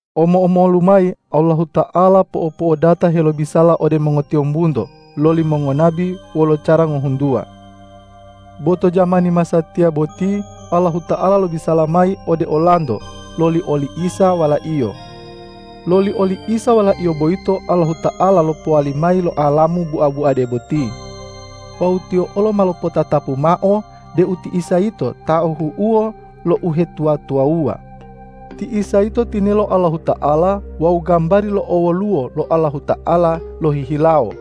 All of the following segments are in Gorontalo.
Omo-omolu mayi Allahuta'ala po'opo'odata helobisala ode mongotiyombunto loli mongonabi wolo cara ngohuntuwa. Bo to jamani masatiya boti Allahuta'ala lobisala mayi ode olanto loli oli Isa Wala-Iyo. Loli oli Isa Wala-Iyo boyito Allahuta'ala lopowali mayi lo alamu bua-buade boti. Wawu Tiyo olo ma lopotatapu mao deu ti Isa yito ta ahu'uwo lo uhetuwa-tuwawuwa. Ti Isa yito tinelo Allahuta'ala wawu gambari lo owoluwo lo Allahuta'ala lohihilawo.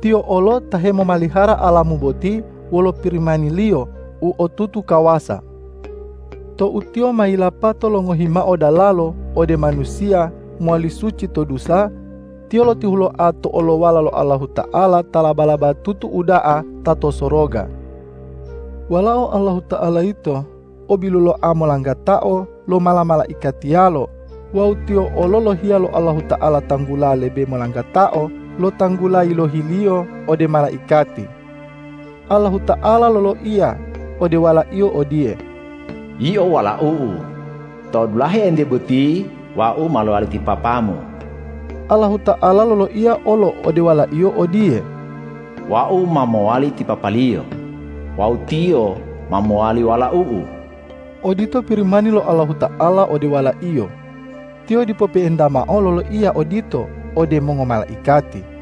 Tiyo olo ta hemomalihara alamu boti wolo Pirimani-Liyo u otutu kawasa. Tou Tiyo ma yilapato longohi mao dalalo ode manusiya mowali suci to dusa, Tiyo lotihuloa to olowala lo Allahuta'ala ta laba-labatutu uda'a ta to soroga. Walao Allahuta'ala yito o biluloa molanggatao lo mala-malaikatiyalo wawu Tiyo olo yilohiya lo Allahuta'ala tanggula lebe molanggatao lo tanggula yilohi-Liyo ode malaikati. Allahuta'ala loloiya ode Wala-Iyo odiye,”Yio Walau-U, to dulahe entiye boti Wau ma lowali ti Papa-Mu.” Allahuta'ala loloiya olo ode Wala-Iyo odiye,”Wau ma mowali ti Papa-Liyo wawu Tiyo ma mowali Walau-U.” Odito Pirimani lo Allahuta'ala ode Wala-Iyo. Tiyo dipo pe'enta mao loloiya odito ode mongomalaikati.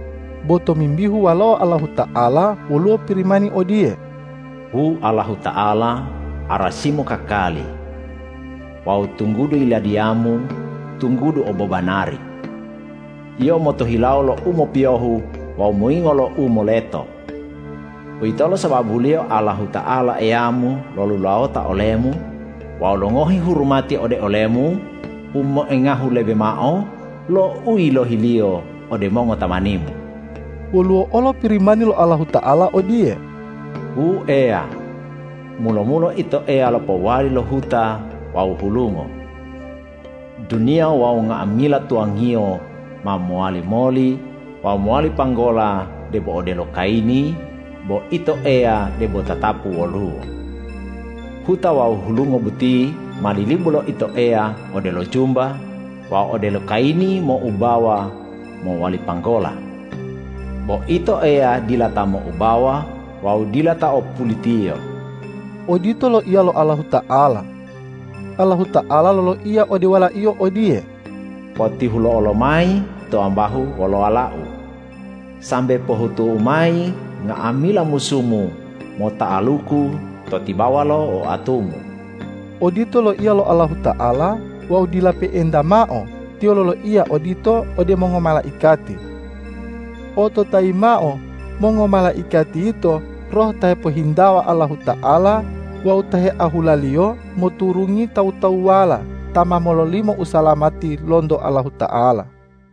Bo tomimbihu Walao Allahuta'ala woluwo Pirimani odiye,”Wu Allahuta'ala, arasi-Mu kakali. Wawu tunggudu Yiladiya-Mu tunggudu obobanari. Yio motohilawo lo u mopiyohu wawu moyingo lo u moleto. Uwitolo sababuliyo Allahuta'ala Eya-Mu lolulawota ole-Mu wawu longohi hurumati ode ole-Mu u moengahu lebe mao lo u yilohi-Liyo ode mongotamani-Mu.” Woluwo olo Pirimani lo Allahuta'ala odiye,”Wu Eya, mulo-mulo Ito Eya lopowali lo huta wawu hulungo. Duniya wawu nga'amila tuwangiyo ma mowali moli wawu mowali panggola debo odelo kayini, bo Ito Eya debo tatapu woluwo. Huta wawu hulunga boti ma lilibu lo Ito Eya odelo jumba wawu odelo kayini moubawa mowali panggola. Bo Ito Eya dila ta moubawa wawu dila ta o pulitiyo.” Odito loiya lo Allahuta'ala. Allahuta'ala loloiya ode Wala-Iyo odiye,”Potihulo'o lomayi to ambahu olowala-U, sambe pohutu-U mayi nga'amila musu-Mu mota'aluku to tibawa lo oatu-Mu!” Odito loiya lo Allahuta'ala wawu dila pe'enta mao Tiyo loloiya odito ode mongomalaikati. Ototayi mao, mongomalaikati yito roh ta hepohintawa Allahuta'ala wawu ta heahula-Liyo moturungi tawu-tawuwala ta ma mololimo usalamati lonto Allahuta'ala.